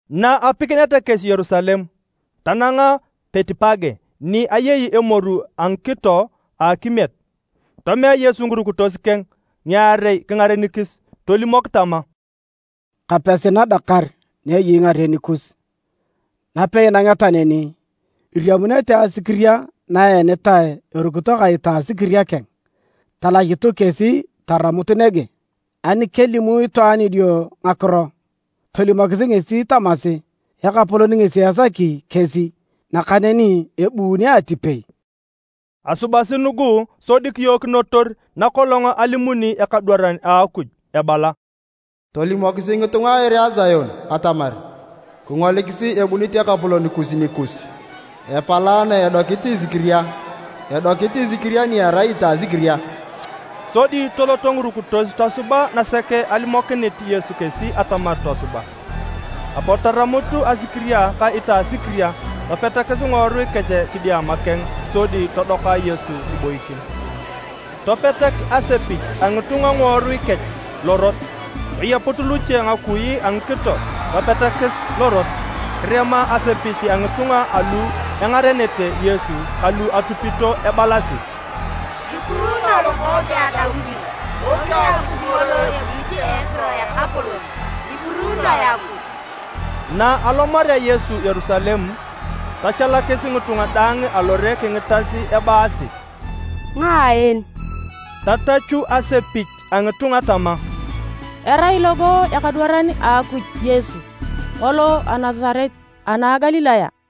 Na apikineta kesi Yerusalem, tananga Betipage ni eyei emoru a ngikito a akimiet. Tomea Yesu ngirukitos keng ngiarei kingarenikis. Tolimok tama, “Kapesi nadakar na eyei ngaren kus. Napei inangeta neni, iriamunete asikiria na eenitae erukito ka itasikiria keng. Talachutu kesi taramut nege. Ani kelimu itwaan idio ngakiro, tolimokisi ngesi tamasi, ‘Ekapolon ngesi esaki kesi’, nakaneni ebuuni atipei.” Asubasi nugu sodi kiyookinotor nakolong alimuni ekadwaran a Akuj ebala: “Tolimokisi ngitunga a ere a Sion atamar. Kingolikisi, ebunit Ekapolon kus nikus! Epalaana edokit esikiria. Edokit isikiria ni erai itasikiria.” Sodi toloto ngirukitos tosuba nasek alimokinit Yesu kesi atamar tosuba. Apot taramut asikiria ka itasikiria topetakis ngiworui kech kidiama keng sodi todoka Yesu kiboikin. Topetak asepich a ngitunga ngiworui kech lorot, toyeput luche ngakui a ngikito topetakis lorot. Kirema asepich a ngitunga alu engarenete Yesu ka lu atupito ebalasi: “Kipuruunoe Lokookeng a Daudi! Topia Akuj ngolo ebunit a ekiro a Ekapolon! Kipuruunoe Akuj.” Na alomarea Yesu Yerusalem tochalakis ngitunga daang alore kingitas ebaasi, “Ngae en?” Tatachu asepich a ngitunga tama, “Erai logo ekadwaran a Akuj Yesu, ngolo a Nasaret ana a Galilaya.”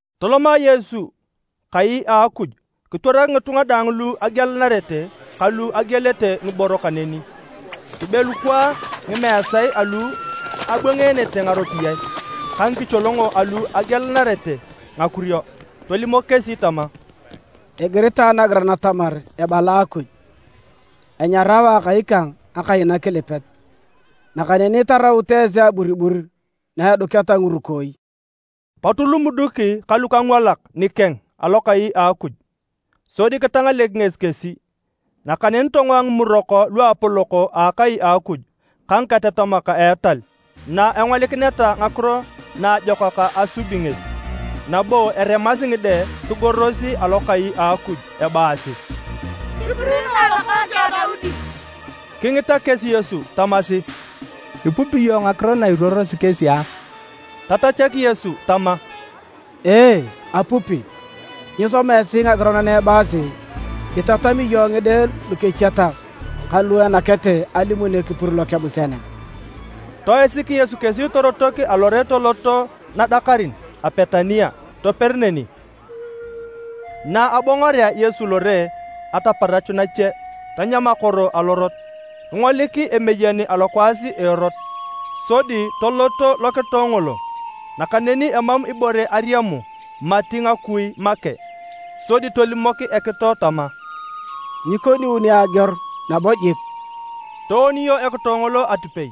Toloma Yesu kai a Akuj kitwarak ngitunga daang lu agielanarete kalu agielete ngiboro kaneni. Kibelukwaa ngimeesae alu abwangeenete ngaropiyae ka ngikicholongo alu agielanarete ngakurio. Tolimok kesi tama, “Igiritae nagiran atamar ebala Akuj, ‘Enyarao Akai kang akai nakilipet.’ Nakaneni itaraut esi aburibur na eduketa ngirukooi.” Pot lumuduk ka lukangwalak nikeng alokai a Akuj, sodi kitangalek ngesi kesi. Nakaneni tongoa ngimurok luapolok a akai a Akuj ka ngiketatamak a etal na engolikineta ngakiro naajokak asubi ngesi. Nabo eremasi ngide kigoros alokai a Akuj ebaasi, “Kipuruunoe Lokookeng a Daudi.” Kingita kesi Yesu tamasi, “Ipupi iyong ngakiro na iruorosi kesi a?” Tatachak Yesu tama, “Ee, apupi. Nyisoma esi ngagiran na ebaasi: ‘Itatam iyong ngide lukechiatak ka luenakete alimun ekipur lokebusian a?’” Toisik Yesu kesi torotok alore tolot nadakarin a Betania, toper neni. Na abongorea Yesu lore ataparach nache, tanyam akoro alorot. Kingolik emeyen alokwaas a erot. Sodi tolot lokitoe ngolo, nakaneni emam ibore ariamu mati ngakui make. Sodi tolimok ekitoe tama, “Nyikoniuni ageor nabo jik.” Tooniyo ekitoe ngolo atipei.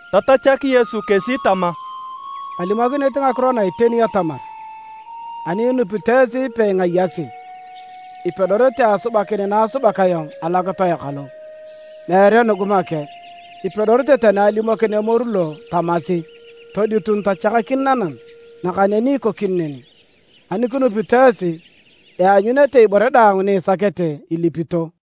Tatachak Yesu kesi tama, “Kalimokinit ngakiro na iteni atamar, ani inupito esi peingayasi, ipedorete asubakin na asubak ayong alokitoe kalo. Meere nugu make. Ipedorete tani alimokin emoru lo tamasi, ‘Toditun tochakakin nanam,’ nakaneni ikokini neni. Ani kinupito esi, ianyunete ibore daang ni isakete ilipito.”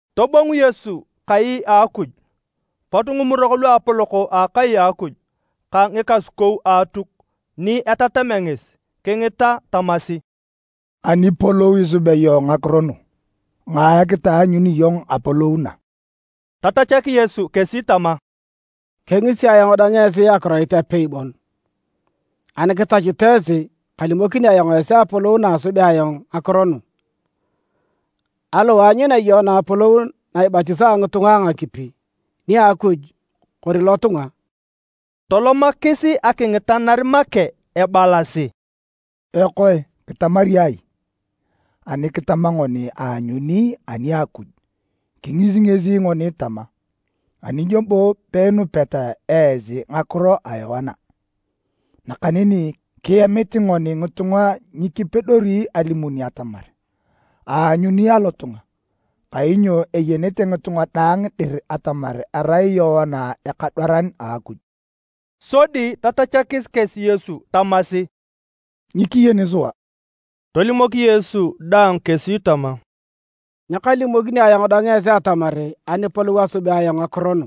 Tobongu Yesu kai a Akuj, pot ngimurok luapolok a Akai a Akuj ka ngikasukou a Atuk ni etatamea ngesi kingita tamasi, “Anipolou isubea iyong ngakiro nu? Ngae kitaanyuni iyong apolou na?” Tatachak Yesu kesi tama, “Kengisi ayong dang esi akiroit apei bon. Ani kitachut esi, kalimokini ayong esi apolou na asubea ayong ngakiro nu. Aliwae aanyunea Yoana apolou na ibatisaa ngitunga a ngakipi, nia Akuj kori lotunga?” Tolomakis akingitanar make ebalasi, “Ekoe, kitamari ai? Ani kitama ngoni, ‘Aanyuni ani a Akuj,’ kingisi ngesi ngoni tama, ‘Ani nyo bo peinupeta esi ngakiro a Yoana?’ Nakaneni kiemit ngoni ngitunga nyikipedori alimun atamar, ‘Aanyuni alotunga,’ kainyo eyenete ngitunga daang dir atamar arai Yoana ekadwaran a Akuj.” Sodi tatachakis kesi Yesu tamasi, “Nyikiyeni sua.” Tolimok Yesu dang kesi tama, “Nyakalimokini ayong dang esi atamar anipolou asubea ayong ngakiro nu.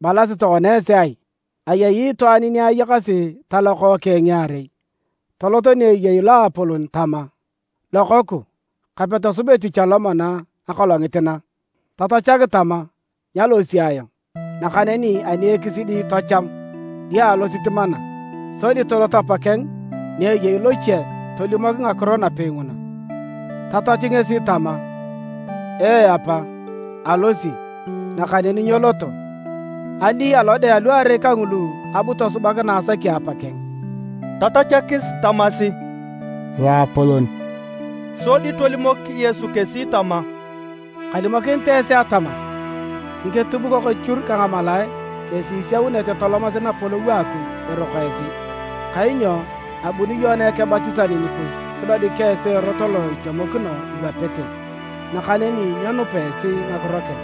“Ibalasi tokona esi ai? Ayei itwaan ni ayakasi talokookeng ngiarei. Tolot ni ayei loapolon tama: ‘Lokoku, kape tosub etich alomana akolongit na.’ Tatachak tama: ‘Nyalosi ayong,’ nakaneni ani ekisidi tocham, dio alosit mana. Sodi tolot apakech ni ayei loche tolimok ngakiro napei nguna. Tatachu ngesi tama: ‘Ee apa, alosi’, nakaneni nyeloto. Ali alode aluarei kangulu abu tosubak na asaki apa keng?” Tatachakis tamasi, “Loapolon.” Sodi tolimok Yesu kesi tama, “Kalimokinit esi atamar, ngiketubukok echur ka ngamalaae kesi isiaunete tolomasi napolou a Akuj eroko esi. Kainyo abuni Yoana Ekebatisan nikus kidodik esi erot lo itemokino iwapete, nakaneni nyenupa esi ngakiro keng.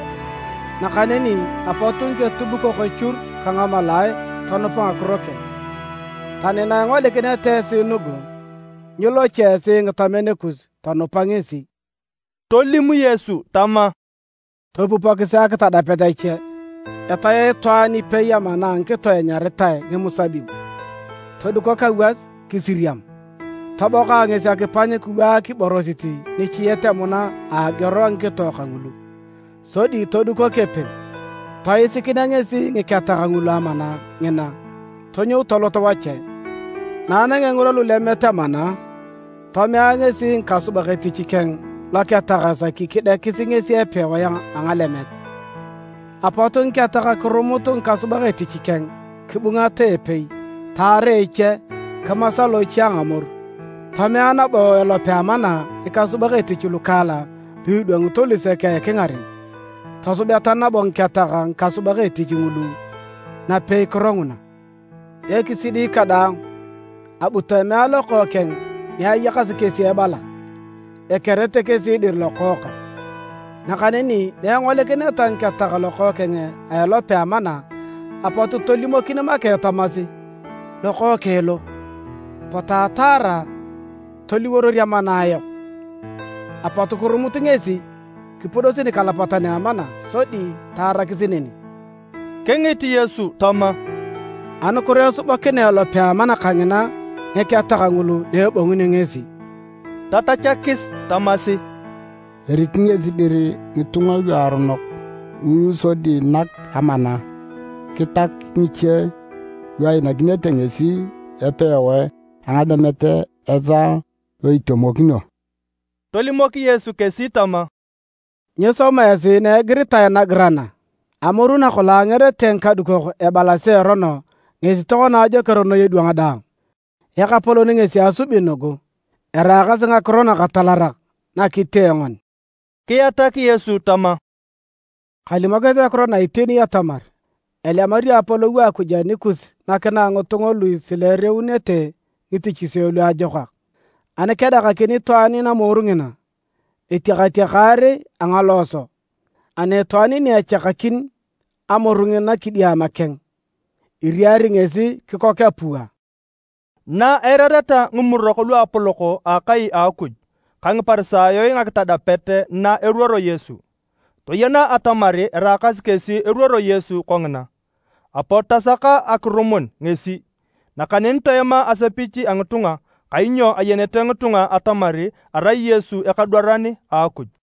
Nakaneni apot ngiketubukok echur ka ngamalaae tonupa ngakiro keng. Tani na ingolikineta esi nugu, nyilocho esi ngitamen kus tonupa ngesi.” Tolim Yesu tama, “Topupokisi akitadapet ache. Etae itwaan ipei amana a ngikito enyaritae ngimusabib todukok awas kisiriam. Toboka ngesi akipany kiwaak iborosit nichiet emuna a ageor a ngikito kangulu, sodi todukok epem. Toisikinea ngesi ngiketak ngulu amana ngina, tonyou tolot wache. Na anangea ngirwa lulemet amana, tomea ngesi ngikasubak etich keng loketak esaki kidiekis ngesi epewae a ngalemet. Apot ngiketak kirumut ngikasubak etich keng, kibungata epei, taara eche, kimasa loche a ngamoru. Tomea nabo elope a amana ngikasubak etich lukaalak lu edwangito lusek a ekingaren, tosubeta nabo ngiketak ngikasubak etich ngulu napeikiro nguna. Ekisidi kadaang, abu tomea lokookeng ni ayakasi kesi ebala, ‘Ekerete kesi dir lokookang’. Nakaneni na engolikineta ngiketak lokookeng a elope a amana apot tolimokin make tamasi: ‘Lokookeng lo. Potu ataara toliworor amana ayok!’ Apot kirumut ngesi, kipudosi nikalapatan a amana sodi taarakis neni.” Kingit Yesu tama, “Anukiro esubakinea elope a amana kangina ngiketak ngulu na ebongunio ngesi?” Tatachakis tamasi, “Eari ngesi dir ngitunga luaronok ngulu sodi nak amana ngiketak ngiche lu einakinete ngesi epewae a ngalemet esaa lo itemokino.” Tolimok Yesu kesi tama, “Nyisoma esi na igiritae nagiran a? ‘Amoru nakolong angerete ngikadukok ebalasi erono ngesi tokona ajoker noi edwang daang. Ekapolon ngesi asubi nugu. Eraakasi ngakiro nakatalarak na kitee ngoni!’” Kiatak Yesu tama, “Kalimokinit ngakiro na iteni atamar, elemario apolou a Akuj anikus nakinae ngitunga lu isileereunete ngitichisio lu ajokak. [ Ani kedakakin itwaan namoru ngina etiakatiakar a ngalooso, ani itwaan ni echakakin amoru ngina kidiama keng, iriari ngesi kikok apua.”] Na eirareta ngimurok luapolok a akai a Akuj ka Ngiparisayo ngakitadapet na eruoro Yesu, toyena atamar eraakasi kesi eruoror Yesu kongina. Apot tasaka akirumun ngesi. Nakaneni toema asepich a ngitunga kainyo ayenete ngitunga atamar erai Yesu ekadwaran a Akuj.